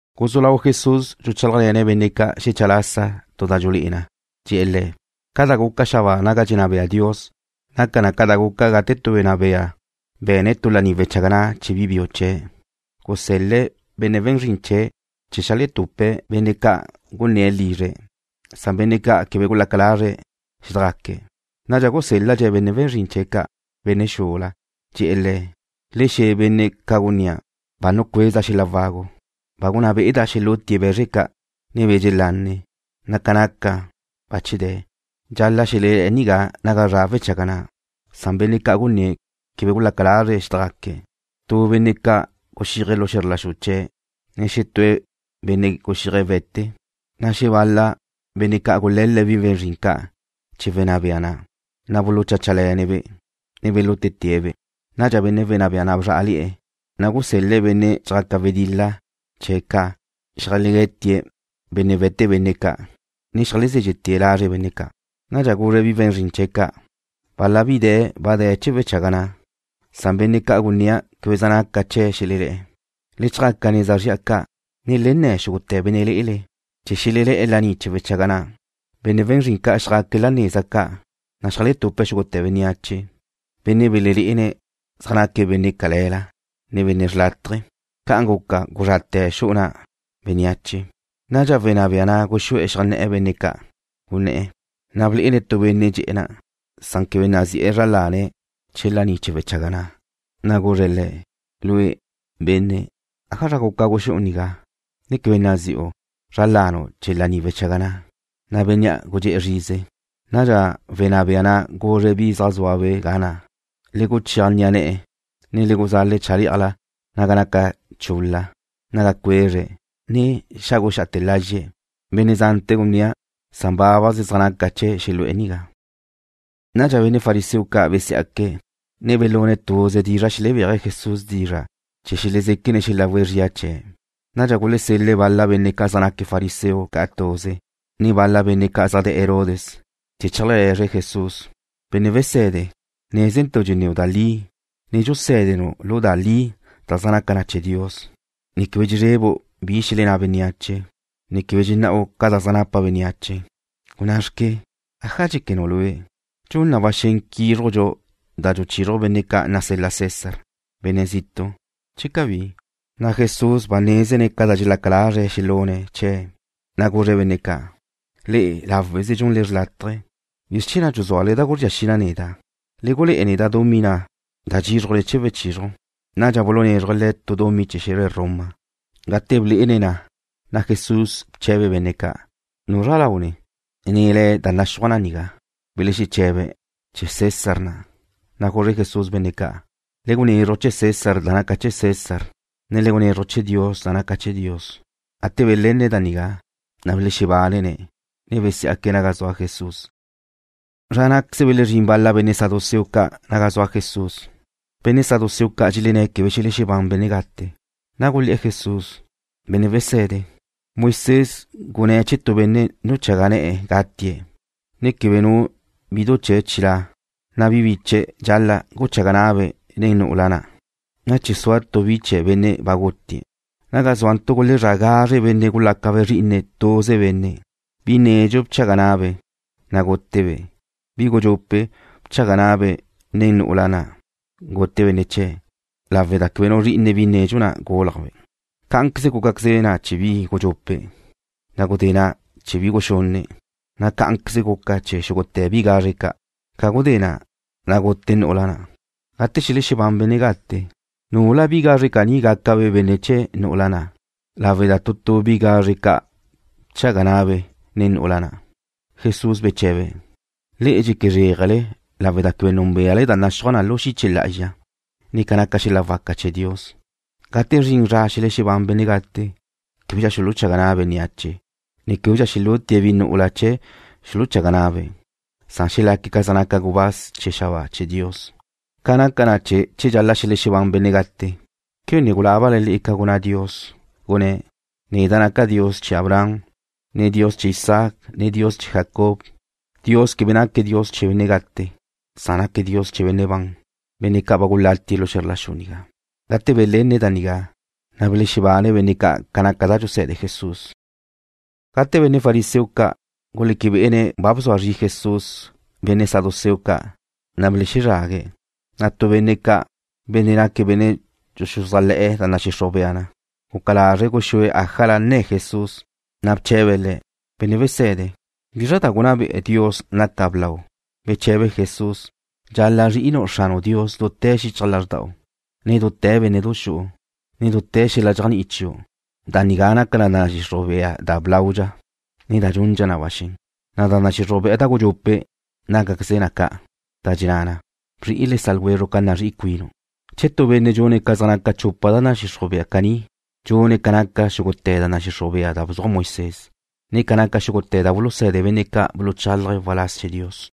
Guzú lau Jesús dxuchálajle̱ne̱' benne' ca' xecha lasa tu da dxulé'e na, dxe̱'e̱ le̱': ―Ca da gaca xabáa naga dxenná bea Dios naca na ca da guca gate tu benne' wenná bea be̱ne̱' tu laní wechaga na' chee̱ bi biu chee̱'. Gusel-le̱' benne' we̱n zrin chee̱' ca' cheajletupe̱' benne' ca'an gunné̱' lizre̱', san benne' ca' quebe gulaca lazre̱' xédajgaque̱'. Nadxa gusél-ladxe̱' benne' we̱n zrin chee̱' ca', benne' xula. Dxe̱'e̱ le̱': “Le xe̱ benne' ca' gunnía', ba nucueza' xel-la' wagu. Ba gunná be'eda' xelútie̱' be̱zre ca', ne be̱ dxelanne, na' ca naca na bache de̱. Dxal-la' xelelé̱'e̱ nigá naga zra' wechaga na'.” Benne' ca' gunné̱' quebe gulaca lazre̱' xédajgaque̱'. Tu benne' ca' guxíaje̱' lu xe̱zr la xu chee̱', ne xetú benne' guxíaje̱' we̱te. Xebal-la benne' ca' gule̱le̱' bi we̱n zrin ca' chee̱ wenná bea na', na' bulucháchale̱ne̱'-be', ne belútete̱'-be'. Nadxa wenná bea na' bzrá'ale̱'e̱, na' gusel-le̱' benne' chee̱' ca', benne' zjaca wedil-la xeajlegué̱tie̱' benne' we̱te benne' ca', ne xeajlezézxe'te̱' lazre' benne' ca'. Nadxa guzre̱' bi we̱n zrin chee̱' ca': “Bal-la bi de̱ ba de̱ chee̱ wechaga na', na' benne' ca' gunnía' quebe zaj naca chee̱' xelelé̱'e̱. Le chjaca neza zri'a ca', ne le nne̱ xúgute̱ benne' lé'ele, chee̱ xelelé̱'e̱ laní chee̱ wechaga na'.” Benne' we̱n zrin ca' xjaque̱' la neza ca', na' xeajletupe̱' xúgute̱ bénneache, benne' belelé'ene̱' zaj naque̱' benne' cale̱la, ne benne' xrlátaje. Ca'an guca guzrate̱ xu'u na' bénneache. Nadxa wenná bea na' guxú'e̱ xeajné̱'e̱ benne' ca' gunné̱', na' blé'ene̱' tu benne' dxe'e̱ na', quebe nazi'e̱ zra lane̱' chee̱ laní chee̱ wechaga na'. Guzre̱' le̱': “Lue', benne', ¿ájazra guca guxú'u nigá, ne quebe nazi'u zra lanu' chee̱ laní wechaga na'?” Bénnea' gudxé'e̱ zrize. Nadxa wenná bea na' guzre̱' bi zaj zúabe' ga na', “Le guchéaj ni'a ne̱'e̱, ne le guzale̱' chalé'ajla naga naca chul-la, naga cuezre̱', ne xáguxa'ate̱ lazxe̱'.” Benne' zante̱ gunnía', na' bábaze̱' zaj naca chee̱' xelu'e̱ nigá. Nadxa benne' fariseo ca' besiá'que̱', ne belune̱' tuze dizra' xelebéaje̱' Jesús dizra' chee̱ xelezéquene̱' xelawe̱' zría chee̱'. Nadxa gulesel-le̱' bal-la benne' ca' zaj naque̱' fariseo ca' tuze, ne bal-la benne' ca' zaj de̱'e̱ Herodes, chee̱ zeajlegue̱zre̱' Jesús: ―Benne' wese̱de, nézentu' dxenníu' da li, ne dxusé̱denu' da li da zaj naca chee̱ Dios, ne quebe dxezrebu' bi xelenná bénneache, ne quebe dxenná'u ca da zaj napa bénneache. Gunná xque. ¿Aja dxéquenu' lue'? ¿Dxun na ba xen quízrujdxu da dxuluchizruj benne' ca' nasel-la César, benne' zitu', che cabí? Jesús ba nézene̱' ca da dxelaca lazre̱' xelune̱' chee̱', na' guzre̱' benne' ca': ―Le'e, láweze dxunle da xrlátaje. ¿Bizr chee̱ na' dxuzúale da guzría xi na neda'? Le gulé'e neda' dumí na' da dxízrujle chee̱ wechizruj. Nadxa bulunézruje̱' Le̱' tu dumí chee̱ xe̱zre Roma. Gate blé'ene̱' na, na' Jesús bche̱be̱' benne' ca': ―¿Nuzra lau ni, ne le̱' da naxúaj na nigá? Belexeche̱be̱': ―Chee̱ César na'. Na' guzre Jesús benne' ca': ―Le gunezruj chee̱ César da naca chee̱ César, ne le gunezruj chee̱ Dios da naca chee̱'. Gate belenne̱' da nigá, na' belexebánene̱', ne besiá'que̱' naga zua Jesús. Zra ná'queze belezrín bal-la benne' saduceo ca' naga zua Jesús. Benne' saduceo ca' dxelenné̱' quebe xelexebán benne' gate. Gulé̱'e̱ Jesús: ―Benne' wese̱de, Moisés gunné̱' che tu benne' nuchaga ne̱'e̱ gatie̱', ne quebe nu bidu chee̱' chilá', na' bi biche̱' dxal-la' guchaga na'abe' nen nu'ula gute benne' biu chee̱' na' chee̱ sua tu bi chee̱ benne' ba gutie̱'. Naga zúantu' gulezrá' gazre benne' gulácabe' zri'ine tuze benne'. Bi nedxu bchaga na'abe', na' gútebe'. Bi gudxupe' bchaga na'abe' nen nu'ula na' gute benne' biu chee̱' lawe' da quebe nu zri'ine bi nedxu na' gúlajbe'. Cá'anqueze gúcaqueze na chee̱ bi gudxupe', na' gudé na' chee̱ bi guxunne', na' cá'anqueze guca chee̱ xúgute̱ bi gazre ca'. Ca gudé na', na' gute nu'ula na'. Gate xelexebán benne' gate, ¿nula bi gazre caní gácabe' benne' chee̱ nu'ula na' lawe' da tu tu bi gazre ca' bchaga na'abe' nen nu'ula na'? Jesús beche̱be̱': ―Le'e dxeque zréajele lawe' da quebe núnbeale da naxúaj na lu xiche lá'azxa, ne ca naca xel-la' waca chee̱ Dios. Gate zrin zra xelexebán benne' gate, québedxa xuluchaga na' bénneache, ne québedxa xelútie̱' bi nu'ula chee̱ xuluchaga na'abe'. Xelaque̱' ca zaj naca gubáz chee̱ xabáa chee̱ Dios. Ca naca na che dxal-la' xelexebán benne' gate, ¿quebe ne gulábale le'e ca gunná Dios? Gunné̱': “Neda' naca' Dios chee̱ Abraham, ne Dios chee̱ Isaac, ne Dios chee̱ Jacob.” Dios quebe naque̱' Dios chee̱ benne' gate, san naque̱' Dios chee̱ benne' ban, benne' ca' ba gulatie̱' lu xe̱zr la xu nigá. Gate belenne̱' da nigá, na' belexebane benne' ca' ca naca da dxuse̱de Jesús. Gate benne' fariseo ca' guleque bé'ene̱' ba bzua zri Jesús benne' saduceo ca', na' belezrague̱'. Tu benne' ca', benne' naque̱' benne' dxuxuzájle̱'e̱ da nadxixruj bea na, guca lazre̱' guxúe̱' ájala nne̱ Jesús. Bche̱be̱' Le̱': ―Benne' wese̱de, ¿bizrla da gunná be'e Dios naca blau? Beché̱be Jesús: ―Dxal-la' zri'inu' Xranu' Dios dute̱ xichaj lázrda'u, ne dute̱ bénne'du xu'u, ne dute̱ xel-la' dxéajni'i chiu'. Da nigá naca da nadxixruj bea da blaudxa, ne da dxundxa na ba xen. Da nadxixruj bea da gudxupe' nácaqueze na ca', da dxenná na: Bzri'i le sa' ljwezru' ca nazrí'i cuinu'. Che tu benne' dxune̱' ca zaj naca chupa da nadxixruj bea caní, dxune̱' ca naca xúgute̱ da nadxixruj bea da bzuaj Moisés, ne ca naca xúgute̱ da buluse̱de benne' ca' buluchálaje̱' waláz chee̱ Dios.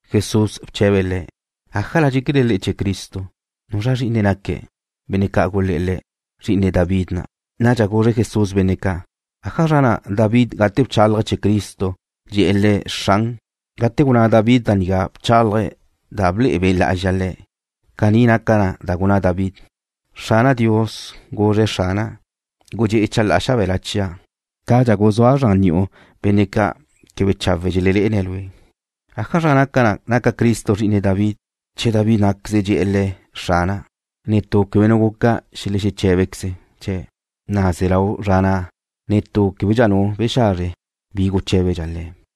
Jesús bche̱be̱' le̱': ―¿Ájala dxéquele le'e chee̱ Cristo? ¿Nuzra zri'ine naque̱'? Benne' ca' gulé̱'e̱ Le̱': ―Zri'ine David na'. Nadxa guzre Jesús benne' ca': ―¿Ájazra na' David gate bchálaje̱' chee̱ Cristo dxe̱'e̱ Le̱': Xran? Gate gunná David da nigá bchálaje̱' da ble'e Be' Lá'azxa le̱'. Caní naca da na' gunná David: Xrana' Dios guzre̱' Xrana': “Gudxé'e chalá'a xabe̱la chia' cadxa guzúa' zran ni'u benne' ca' quebe chawe' dxelelé'ene̱' Lue'.” ¿Ájazra naca na naca Cristo zri'ine David, che David ná'queze dxe̱'e̱ Le̱': “Xrana'”? Quebe nu benne' guca xeché̱bequeze̱' chee̱', na' ze lau zra na' netú québedxa nu bexazre bi guché̱bedxa Le̱'.